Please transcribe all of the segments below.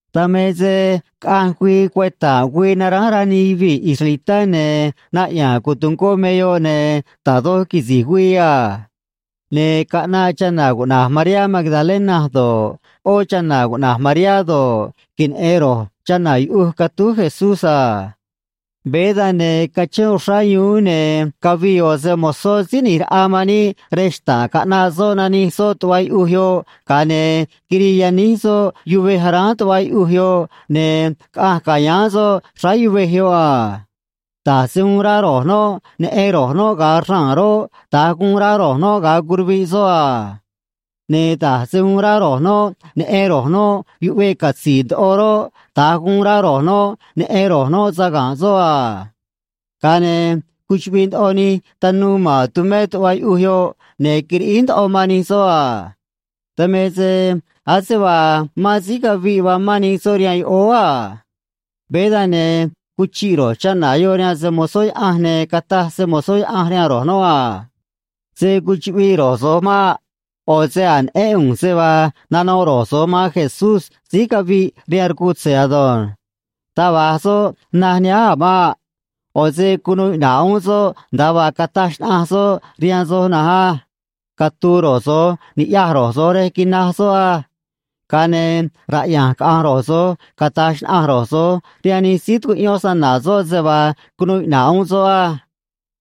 Dan me se caꞌanj güii cueta̱nꞌ güii naránj rá nij yuvii̱ israelitá, ne̱ naꞌya̱a̱n cotungó me yoꞌ, ne̱ da̱j doj quisi̱j güii a. Ne̱ caꞌnaꞌ chana̱ cuꞌna̱j Mariá Magdalena do̱ꞌ, ꞌó chana̱ cuꞌna̱j Mariá do̱ꞌ, queneꞌe̱n ro̱j chana̱ yuꞌuj catúj Jesús a. Veé dan, ne̱ cachén uxrá yuún, ne̱ cavii ꞌo̱ se‑mo̱zó Síí ꞌNi̱j Raꞌa man níꞌ rej xta̱ꞌ, caꞌnaꞌ soꞌ, nanij soꞌ tuꞌva yuꞌuj yoꞌ, ga̱a ne̱ quirii yaníj soꞌ yuvej aráán tuꞌva yuꞌuj yoꞌ, ne̱ caꞌanj ca̱yáán soꞌ xráá yuvej yoꞌ a. Da̱j se uun rá ro̱j noꞌ neꞌen ro̱j noꞌ ga̱a raa̱n roꞌ, da̱nj guun rá ro̱j noꞌ ga̱a curuviꞌ soꞌ a. Ne̱ da̱j se uun rá ro̱j noꞌ neꞌen ro̱j noꞌ yuꞌveꞌ catzi̱i̱ ndoꞌo roꞌ, da̱nj guun rá ro̱j noꞌ neꞌen ro̱j noꞌ saga̱nꞌ soꞌ a. Ga̱a ne̱ cuchuꞌviꞌ ndoꞌo nij tanuu ma̱n tumé tuꞌva yuꞌuj yoꞌ, ne̱ quiriꞌíj ndoꞌo man nij soꞌ a. Dan me se ase vaa mán síí caviꞌ vaa mán nij soꞌ rihaan yoꞌóó a. Veé dan, ne̱ cuchiꞌ ro̱j chana̱ yoꞌ rihaan se‑mo̱zó Yaꞌanj, ne̱ cataj se‑mo̱zó Yaꞌanj rihaan ro̱j noꞌ a: ―Se̱ cuchuꞌviꞌ ro̱j so̱j maꞌ. ꞌO̱ se a̱j neꞌén ꞌu̱nj se vaa nanoꞌ ro̱j so̱j man Jesús síí caviꞌ rihaan rcutze̱ ado̱nj. Taj va̱j soꞌ naj nihánj a̱ maꞌ. ꞌO̱ se cunuu iꞌna̱ꞌ uún soꞌ, nda̱a vaa cataj xnaꞌanj soꞌ rihaan soj na̱nj á. Catu̱u̱ ro̱j so̱j ni̱ꞌyaj ro̱j so̱j rej quinaj soꞌ á. Ga̱a ne̱ raꞌya̱nj caꞌa̱nj ro̱j so̱j, cata̱j xnaꞌanj ro̱j so̱j rihaan nij síí tucuꞌyón snana̱ soꞌ se vaa cunuu iꞌna̱ꞌ uún soꞌ á.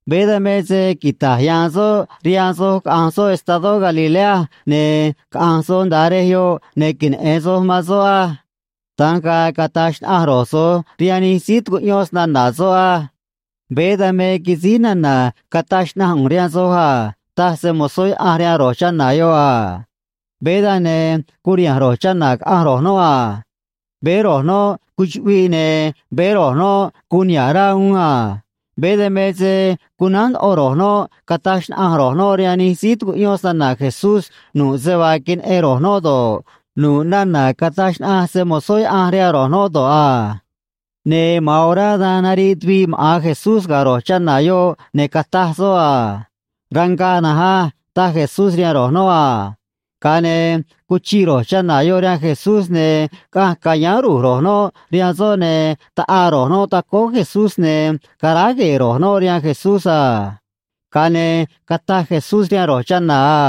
Veé dan me se quita̱j ya̱a̱n soꞌ rihaan soj caꞌa̱nj soꞌ estadó Galilea, ne̱ caꞌa̱nj soj nda̱a rej yoꞌ, ne̱ queneꞌe̱n soj man soꞌ á. Da̱nj ga̱a̱ cata̱j xnaꞌanj ro̱j so̱j rihaan nij síí tucuꞌyón snana̱ soꞌ á. Veé dan me quisíj nana̱ cataj xnaꞌanj ꞌu̱nj rihaan soj a ―taj se‑mo̱zó Yaꞌanj rihaan ro̱j chana̱ yoꞌ a. Veé dan, ne curiha̱nj ro̱j chana̱ caꞌanj ro̱j noꞌ a. Veé ro̱j noꞌ cuchuꞌviꞌ, ne̱ veé ro̱j noꞌ guun niha̱ꞌ rá uún a. Veé dan me se cunánj ndoꞌo ro̱j noꞌ, cata̱j xnaꞌanj ro̱j noꞌ rihaan nij síí tucuꞌyón snana̱ Jesús nu̱ꞌ se vaa queneꞌen ro̱j noꞌ do̱ꞌ, nu̱ꞌ nana̱ cataj xnaꞌanj se‑mo̱zó Yaꞌanj rihaan ro̱j noꞌ do̱ꞌ a. Ne̱ ma̱an orá dan nariꞌ tuviꞌ maꞌa̱n Jesús ga̱ ro̱j chana̱ yoꞌ, ne̱ cataj soꞌ a: ―Rangaꞌ na̱nj á ―taj Jesús rihaan ro̱j noꞌ a. Ga̱a ne̱ cuchiꞌ ro̱j chana̱ yoꞌ rihaan Jesús, ne̱ caꞌanj ca̱yáán ru̱j ro̱j noꞌ rihaan soꞌ, ne̱ taꞌaa ro̱j noꞌ tacóó Jesús, ne̱ caráj gue̱e̱ ro̱j noꞌ rihaan Jesús a. Ga̱a ne̱ cataj Jesús rihaan ro̱j chana̱ a: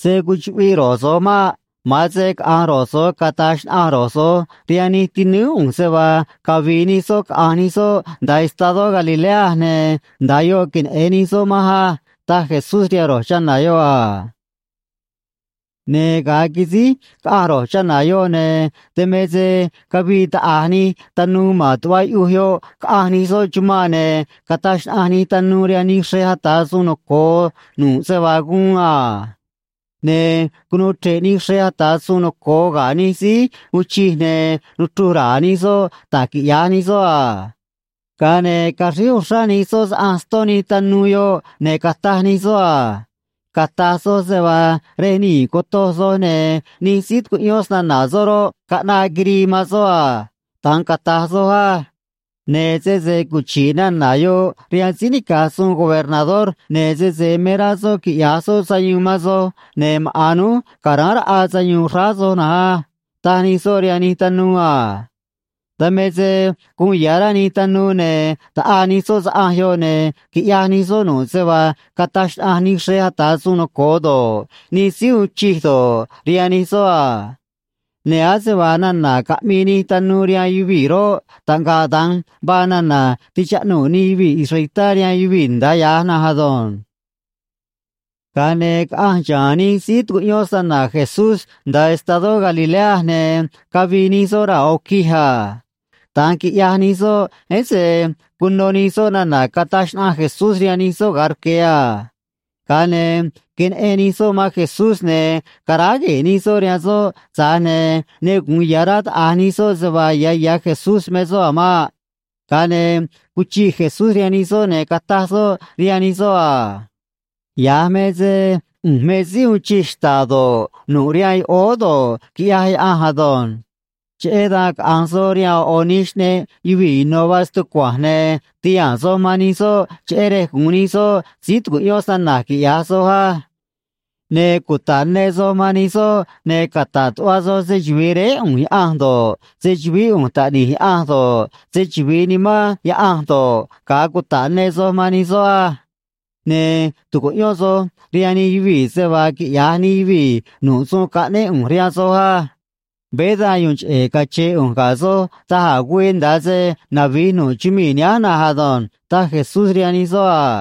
―Se̱ cuchuꞌviꞌ ro̱j so̱j maꞌ. Ma̱an se caꞌa̱nj ro̱j so̱j cata̱j xnaꞌanj ro̱j so̱j rihaan nij tinúú ꞌu̱nj se vaa cavi̱i̱ nij soꞌ caꞌa̱nj nij soꞌ nda̱a estadó Galilea, ne̱ nda̱a yoꞌ queneꞌe̱n nij soꞌ manj á ―taj Jesús rihaan ro̱j chana̱ yoꞌ a. Ne̱ ga̱a quisíj caꞌanj ro̱j chana̱ yoꞌ, ne̱ dan me se cavii taꞌa̱j nij tanuu ma̱n tuꞌva yuꞌuj yoꞌ caꞌanj nij soꞌ chumanꞌ, ne̱ cataj xnaꞌanj nij tanuu rihaan nij xrej ata̱ suun noco̱o nu̱ꞌ se vaa guun a. Ne̱ cunuu chre̱ꞌ nij xrej ata̱ suun noco̱o ga̱ nij síí uun chij, ne̱ nuchruj ra̱a̱ nij soꞌ da̱j quiꞌya̱j nij soꞌ a. Ga̱a ne̱ caxríj uxrá nij soꞌ saꞌanj ston nij tanuu yoꞌ, ne̱ cataj nij soꞌ a: ―Cata̱j soj se vaa rej nii̱ cotoj soj, ne̱ nij síí tucuꞌyón snana̱ soꞌ roꞌ, caꞌnaꞌ quirii man soꞌ a. Da̱nj cata̱j soj á. Ne̱ sese cuchi̱ꞌ nana̱ yoꞌ rihaan síí nica̱j suun gobernador, ne̱ sese me rá soꞌ quiꞌya̱j soꞌ sayuun man soj, ne̱ maꞌa̱n núj ca̱ráán raꞌa sayuun xráá soj na̱nj á ―taj nij soꞌ rihaan nij tanuu a. Dan me se guun ya̱ rá nij tanuu, ne̱ taꞌaa nij soꞌ saꞌanj yoꞌ, ne̱ quiꞌyaj nij soꞌ nu̱ꞌ se vaa cataj xnaꞌanj nij xrej ata̱ suun noco̱o do̱ꞌ, nij síí uun chij do̱ꞌ, rihaan nij soꞌ a. Ne̱ ase vaa nana̱ caꞌmii nij tanuu rihaan yuvii̱ roꞌ, taꞌngaꞌ da̱nj vaa nana̱ tichaꞌnuu̱ nij yuvii̱ israelitá rihaan yuvii̱ nda̱a ya̱j na̱nj ado̱nj. Ga̱a ne̱ caꞌanj xa̱a̱n nij síí tucuꞌyón snana̱ Jesús nda̱a estadó Galilea, ne̱ cavii nij soꞌ raa̱ ꞌo̱ quij a. Da̱nj quiꞌyaj nij soꞌ, ese cuno nij soꞌ nana̱ cataj xnaꞌanj Jesús rihaan nij soꞌ ga̱a rque̱ a. Ga̱a ne̱ queneꞌen nij soꞌ man Jesús, ne̱ caráj gue̱e̱ nij soꞌ rihaan soꞌ, tza̱j ne̱ ne gu̱un ya̱ rá taꞌa̱j nij soꞌ se vaa ya̱ ya̱ Jesús me soꞌ a̱ maꞌ. Ga̱a ne̱ cuchiꞌ Jesús rihaan nij soꞌ, ne̱ cataj soꞌ rihaan nij soꞌ a: ―Ya̱j me se ꞌu̱nj me síí uun chij xta̱ꞌ do̱ꞌ, nu̱ꞌ rihaan yoꞌóó do̱ꞌ, quiꞌyaj Yaꞌanj ado̱nj. Cheꞌé dan caꞌa̱nj soj rihaan ꞌo̱ ꞌo̱ nij xꞌneꞌ yuvii̱ ino̱ vaa stucua̱nj, ne̱ ti̱haa̱n soj man nij soꞌ cheꞌé rej gu̱un nij soꞌ síí tucuꞌyón snana̱j, quiꞌya̱j soj á. Ne̱ cuta̱ꞌ ne soj man nij soꞌ, ne̱ cata̱ꞌ tuꞌva soj se‑chuvi̱i Réé ꞌu̱nj Yaꞌanj do̱ꞌ, se‑chu̱vií ꞌu̱nj Taꞌni̱j Yaꞌanj do̱ꞌ, se‑chuvi̱i Nimán Yaꞌanj do̱ꞌ, ga̱a cuta̱ꞌ ne soj man nij soꞌ á. Ne̱ tu̱cuꞌyón soj rihaan nij yuvii̱ se vaa quiꞌya̱j nij yuvii̱ nu̱ꞌ suun caꞌnéꞌ ꞌu̱nj rihaan soj á. Veé dan yu̱u̱n cheꞌe̱ cache̱e̱ ꞌu̱nj ga̱ soj da̱j a̱ güii, nda̱a se navi̱j nu̱ꞌ chumii̱ nihánj na̱nj ado̱nj ―taj Jesús rihaan nij soꞌ a.